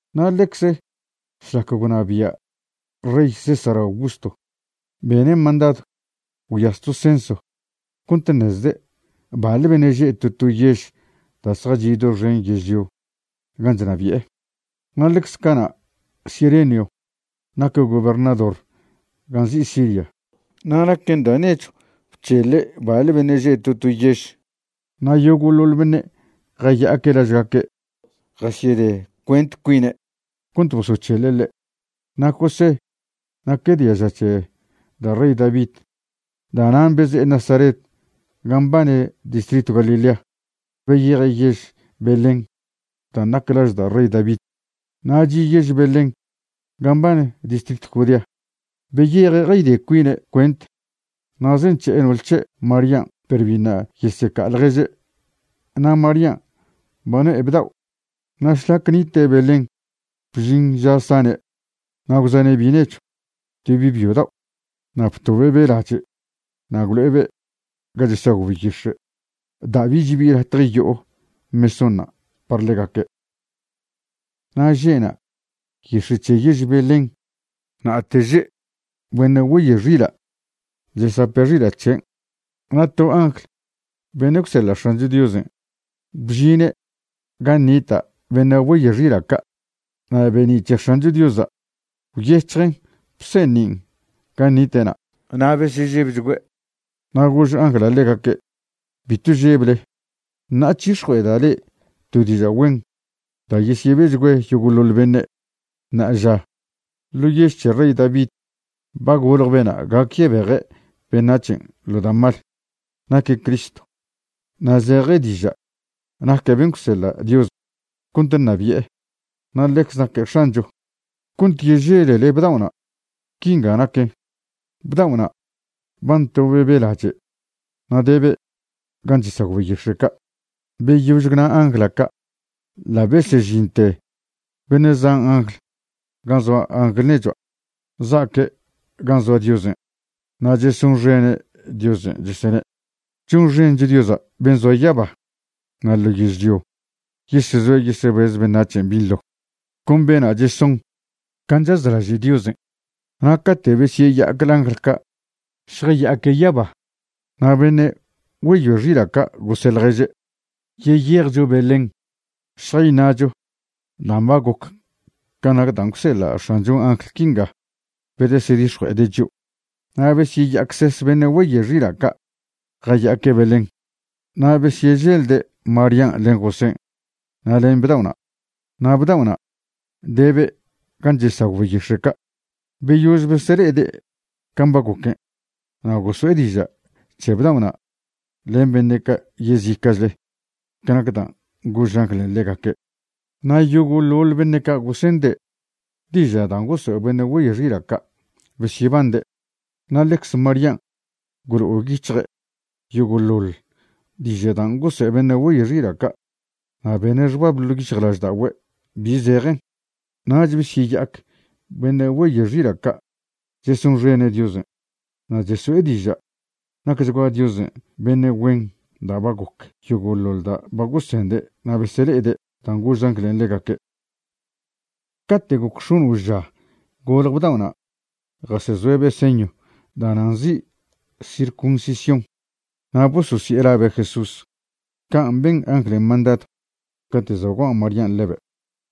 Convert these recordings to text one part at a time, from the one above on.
Na' ḻecz šlac gwnabia' rey César Augusto, bene' mandadw gwyas to censo cont ṉezde' baḻ beṉe' že' to to yež da' zjachi' doxen yežlio gan' chnabi'e. Na' ḻecz cana' Cirenio naque' gobernador gan' nzi' Siria. Na' naquen da' nechw bc̱heḻe' baḻ beṉe' že' to to yež. Na' yogo'ḻoḻ beṉe' jaya'aque' lažgaque' jasyede cuent cuine' cont bosoc̱heḻe' ḻe'. Na' José naque' diaža c̱he da' rey David. Da'nan' beze'e Nazaret gan' mbane distritw Galilea, beyeje' yež Belén dan' nac laž da' rey David. Na' chi' yež Belén gan' mbane distritw Judea. Beyeje' jayde cuine' cuent na' zenc̱he'e no'ol c̱he' Marían' perw biṉa' yeseca'a ḻježe'. Na' Marían' ba no'e bdao'. Na' šlac nite' Belén bžin ža sane'. Na' gwxane' bi' nechw, to bi' byo dao', na' btobe'be' lache' na' gwlo'ebe' ga chesagw beyix̱e', da' bich bi latje yo'o mesónṉa' par ḻegaque'. Na' že'na' yix̱e' c̱he yež Belén na'ate že' beṉe' güeyoe xila' chesape' xila' c̱hen'. Na' to angl beṉe' gwseḻa' X̱ancho Diosen' bžine' gan' nita' beṉe' güeyoe xila' ca', na' be'ni' c̱he X̱ancho Diosa' gwyec̱hjen bseṉin' gan' nite'na'. Na' besežebchgüe'. Na' gož angla' ḻegaque': ―Bitw žeble. Ṉa'a chix̱jue'eda' le'e to diža' güen da' yesebechgüe yogo'ḻoḻ beṉe'. Ṉa'aža ḻo yež c̱he rey David ba golje bena' gac yebeje' beṉac̱hen' ḻo da' mal. Naque' Cristo, na' zeje diža' naque' ben' gwseḻa' Dios cont ṉabi'e, na' ḻecze naque' X̱ancho. Cont yeželele bdao'na', quinga naquen: bdao'na' ba ntobe'be' lache' na' debe' gan' chesagw beyix̱e' ca'. Beyož gwna angla' ca' ḻa' besežinte beṉe' zan angl gan' zoa angl nechua', za'aque' gan' zoa Diosen'. Na' chesonxene' Diosen' chesene': ¡Chonxencho Diosa' ben' zoa yaba, na' ḻo yežlio yesezoa yesebez beṉac̱hen' binḻo, con bena' cheson can' chazlaže' Diosen'. Na' cate' besyeya'ac angl ca' zjaya'aque' yaba, na' beṉe' güeyoe xila' ca' gose' ḻježe': ―Yeyejcho Belén šjayṉa'cho dan' ba goc can' nac dan' gwseḻa' X̱anchon' angl quinga bedesedix̱jue'ede' chio'. Na' beseya'acses beṉe' güeyoe xila' ca' jaya'aque' Belén. Na' besyeželde' Marían' len Josén' na' len bdao'na'. Na' bdao'na' debe' gan' chesagw beyix̱e' ca'. Beyož besele'ede' can' ba goquen, na' goso'e diža' c̱he bdao'na' len beṉe' ca' yezica'chle ca nac dan' gož anglen' ḻegaque'. Na' yogo'ḻoḻ beṉe' ca' gosende' diža' dan' gosoe' beṉe' güeyoe xila' ca' besyebande'. Na' ḻecze Marían' gwlo'o yic̱hje' yogo'ḻoḻ diža' dan' gosoe' beṉe' güeyoe xila' ca' na' bene' xbab ḻo' yic̱hjlažda'ogüe' bi zejen. Nach besyeya'ac beṉe' güeyoe xila' ca' chesonxene' Diosen'. Na' cheso'e diža' nacchgua Diosen' beṉe' güen da' ba goc yogo'ḻoḻ da' ba gosende' na' besele'ede' dan' gož anglen' ḻegaque'. Cate' goc x̱ono' ža golje bdao'na' jasezoe'be' señw da'na' nzi' circuncisión, na' bososi'e labe' Jesús, can' ben anglen' mandadw cate' za' gua' Marían' ḻebe'.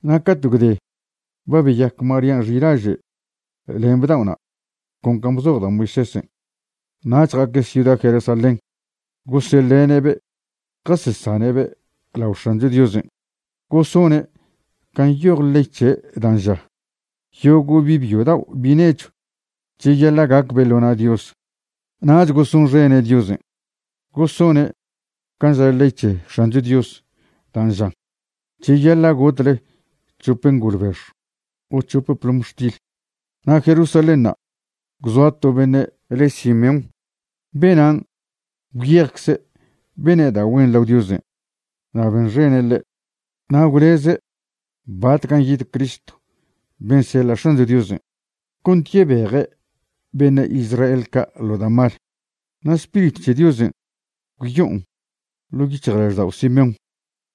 Na' cate' gwde ba beyac Marían' xilaže' len bdao'na' con can' bzoj da' Moisésen', nach ja'aque' ciuda Jerusalén goseḻene'be' jasesane'be' lao X̱ancho Diosen'. Gosone' can' nyoj ley c̱he' dan' ža: “Yogo' bi' byo dao' bi' nechw cheyaḻa' gacbe' ḻo na' Dios.” Nach gosonxene' Diosen', gosone' can' ža ley c̱he X̱ancho Dios dan' žan: “Cheyaḻa' gotle c̱hop ngolbex o c̱hope plomxtil.” Na' Jerusalénṉa' gwzoa to beṉe' le' Simeón. Benan' gwyejcze' bene' da' güen lao Diosen' na' benxene' ḻe', na' gwleze' batcan' yid Cristo ben' seḻa' X̱ancho Diosen' cont yebeje' beṉe' Israel ca' ḻo da' mal. Na' Spiritw c̱he Diosen' gwyo'on ḻo' yic̱hjlaždao' Simeón,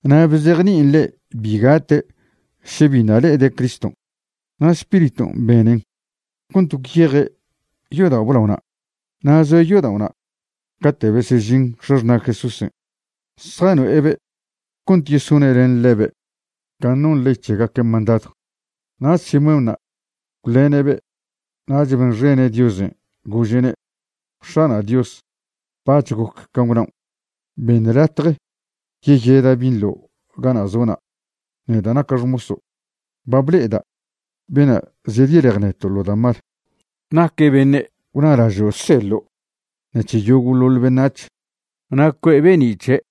na' bzejni'in ḻe' bi gate' še biṉa' le'ede' Criston'. Na' Spiriton' benen cont gwyeje' yodao' blaona', na' zoe' yodao'na' cate' besežin x̱axṉa' Jesúsen' zjano'ebe' cont yesone' len ḻebe' can' non ley c̱hegaquen' mandadw. Nach Simeónṉa' gwḻene'be' nach benxene' Diosen', gože'ne': X̱ana' Dios, bac̱h goc can' gwnaon'. Beṉ latje yeyeda' binḻo gana' zo'na', neda' naca' xmoso'. Ba ble'eda' bena' zedyelej neto' ḻo da' mal. Naque' beṉe' gwnalažo' gwseḻo' ṉec̱he yogo'ḻoḻ beṉac̱h. Na' cue'e be'ni' c̱he'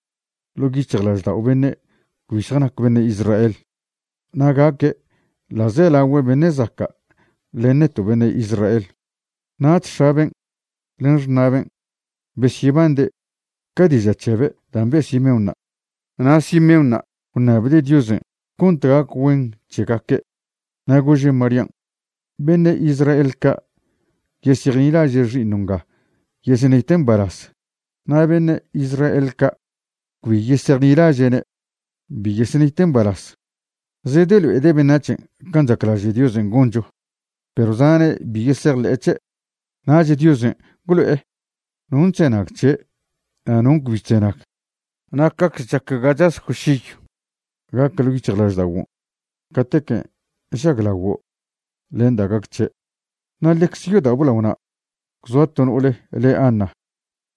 ḻo' yic̱hjlaždao' beṉe' cbi zjanaque' beṉe' Israel. Na' gaque' ḻa'zelagüe beṉe' zaca' len neto' beṉe' Israel. Nach x̱aben' len xṉa'ben' besyebande' ca diža' c̱hebe' dan' be' Simeónṉa'. Na' Simeónṉa' gwṉabde' Diosen' cont gac güen c̱hegaque'. Na' gože' Marían': ―Beṉe' Israel ca' yesejnilaže' xi'iṉo' nga yesenite' mbalaz, na' beṉe' Israel ca' cbi yesejnilaže'ne' bi yesenite' mbalaz. Zedelo'ede' beṉac̱hen' can' chaclaže' Diosen' goncho, perw zane' bi yesejḻe'e c̱he'. Nach Diosen' gwlo'e non' chzenag c̱he' na' non' cbi chzenag. Na' cacze chac ga chaz cwšiyw gac ḻo' yic̱hjlažda'oguon' catequen' žaglaguo' len da' gac c̱he'. Na' ḻecze yodao' blaona' gwzoa to no'ole le Ana,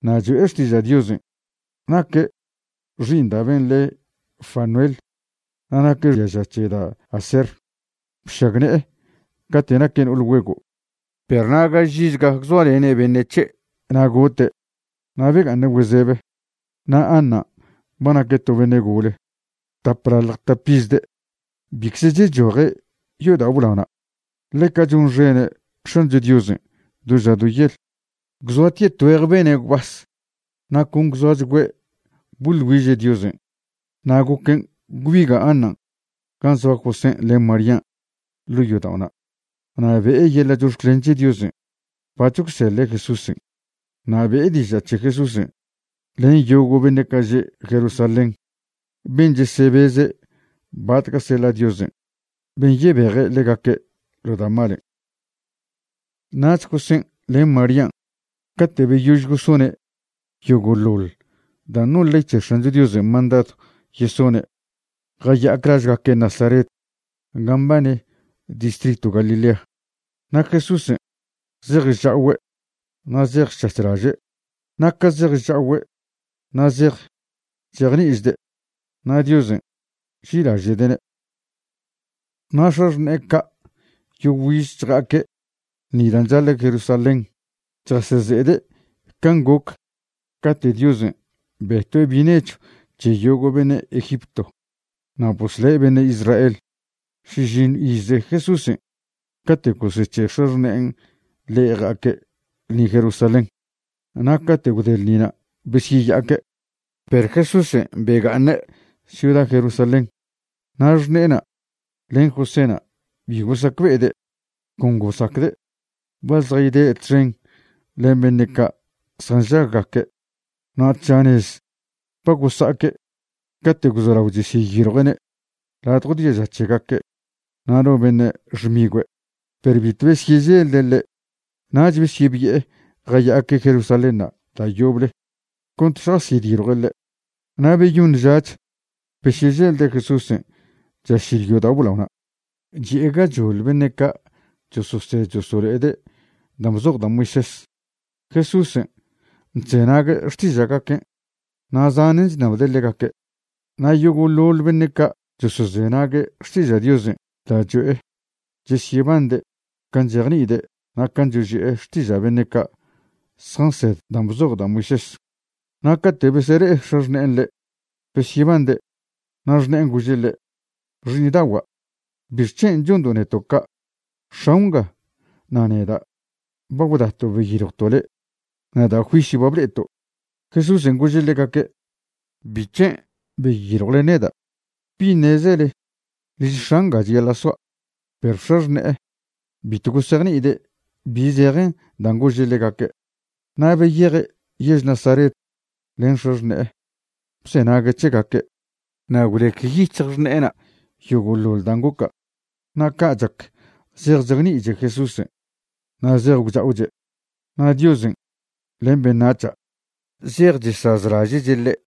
na' cho'e xtiža' Diosen'. Naque' xi'iṉ da' ben' le' Fanuel na' naque' diaža c̱he da' Aser. Bšagne'e cate' naque' no'ol güego', perw na' gaž izga gwzoalene' beṉe' c̱he' na' gote', na' bga'aṉe' güezebe. Na' Anan' ba naque' to beṉe' gole, taplalj tap izde'. Bicze chechoje' yodao' blaona'. Ḻeca chonxene' X̱ancho Diosen' do ža do yel, gwzoatie' tgüeje bene' gwbas na' con gwzoachgüe' boḻ güiže' Diosen'. Na' goquen' gwbiga' Anan' gan' zoa Josén' len Marían' ḻo' yodao'na' na' be'e yeḻa' chox̱clen c̱he Diosen' bac̱h gwseḻe' Jesúsen'. Na' be'e diža' c̱he Jesúsen' len yogo' beṉe' ca' že' Jerusalén ben' chesebeze' batca' seḻa' Diosen' ben' yebeje' ḻegaque' ḻo da' malen'. Nach Josén' len Marían' cate' beyož gosone' yogo'ḻoḻ dan' non ley c̱he X̱ancho Diosen' mandadw yesone', jaya'ac lažgaque' Nazaret gan' mbane distritw Galilea. Na' Jesúsen' zej chcha'ogüe' na' zej chc̱hac̱hlaže'. Na' ca zej chcha'ogüe' na' zej chejni'ichde', na' Diosen' nži'ilaže'de'ne'. Na' x̱axṉe'e ca' yogüiz chja'aque' ḻṉi da' chaḻa' Jerusalén chjaseze'ede' can' goc cate' Diosen' betue' bi' nechw c̱he yogo' beṉe' Egipto na' bosle' beṉe' Israel. Šižiṉw ize Jesúsen' cate' gosec̱he' x̱axṉe'en ḻe' ja'aque' ḻṉin' Jerusalén. Na' cate' gwde ḻṉina' besyeya'aque', perw Jesúsen' bega'aṉe' ciuda Jerusalén. Na' xṉe'ena' len Joséna' bi gosacbe'ede'. Con gosacde' ba zjayde' txen len beṉe' ca' nžaggaque'. Na' tža nez ba gosa'aque' cate' gwzolao chesyeyiljue'ne' ladjo diaža c̱hegaque' na' no beṉe' xmigüe', perw bitw besyeželde' ḻe'. Nach besyebi'e jaya'aque' Jerusalénṉa' da' yoble cont šjasyediljue' ḻe'. Na' beyoṉ žach besyeželde' Jesúsen' chašil yodao' blaona', chi'e gachoḻ beṉe' ca' chososed chosolo'ede' dan' bzoj da' Moisés. Jesúsen' chzenague' xtiža'gaquen' na' zanen chṉabde' ḻegaque'. Na' yogo'ḻoḻ beṉe' ca' chosozenague' xtiža' Diosen' da' cho'e chesyebande' can' chejni'ide' na' can' choži'e xtiža' beṉe' ca' zjansed dan' bzoj da' Moisés. Na' cate' besele'e x̱axṉe'en ḻe', besyebande', na' xṉe'en gože' ḻe': ―Xi'iṉdagua', ¿bixc̱hen' chondo' neto' ca'? X̱ao' nga na' neda' ba gwdato' beyiljwto' le', na' da' juisyw ba ble'eto'. Jesúsen' gože' ḻegaque': ―¿Bic̱hen' beyiljwle neda'? ¿Bi ṉezele liž X̱a' ngan' cheyaḻa' soa'? Perw x̱axṉe'e bitw gosejni'ide' bi zejen dan' gože' ḻegaque'. Na' beyeje' yež Nazaret len x̱axṉe'e bzenague' c̱hegaque'. Na' gwlec yic̱hj xṉe'ena' yogo'ḻoḻ dan' goca'. Na' ca' chac zej chejni'iche Jesúsen' na' zej gwcha'oche', na' Diosen' len beṉac̱ha' zej chesazlaže'che' ḻe'.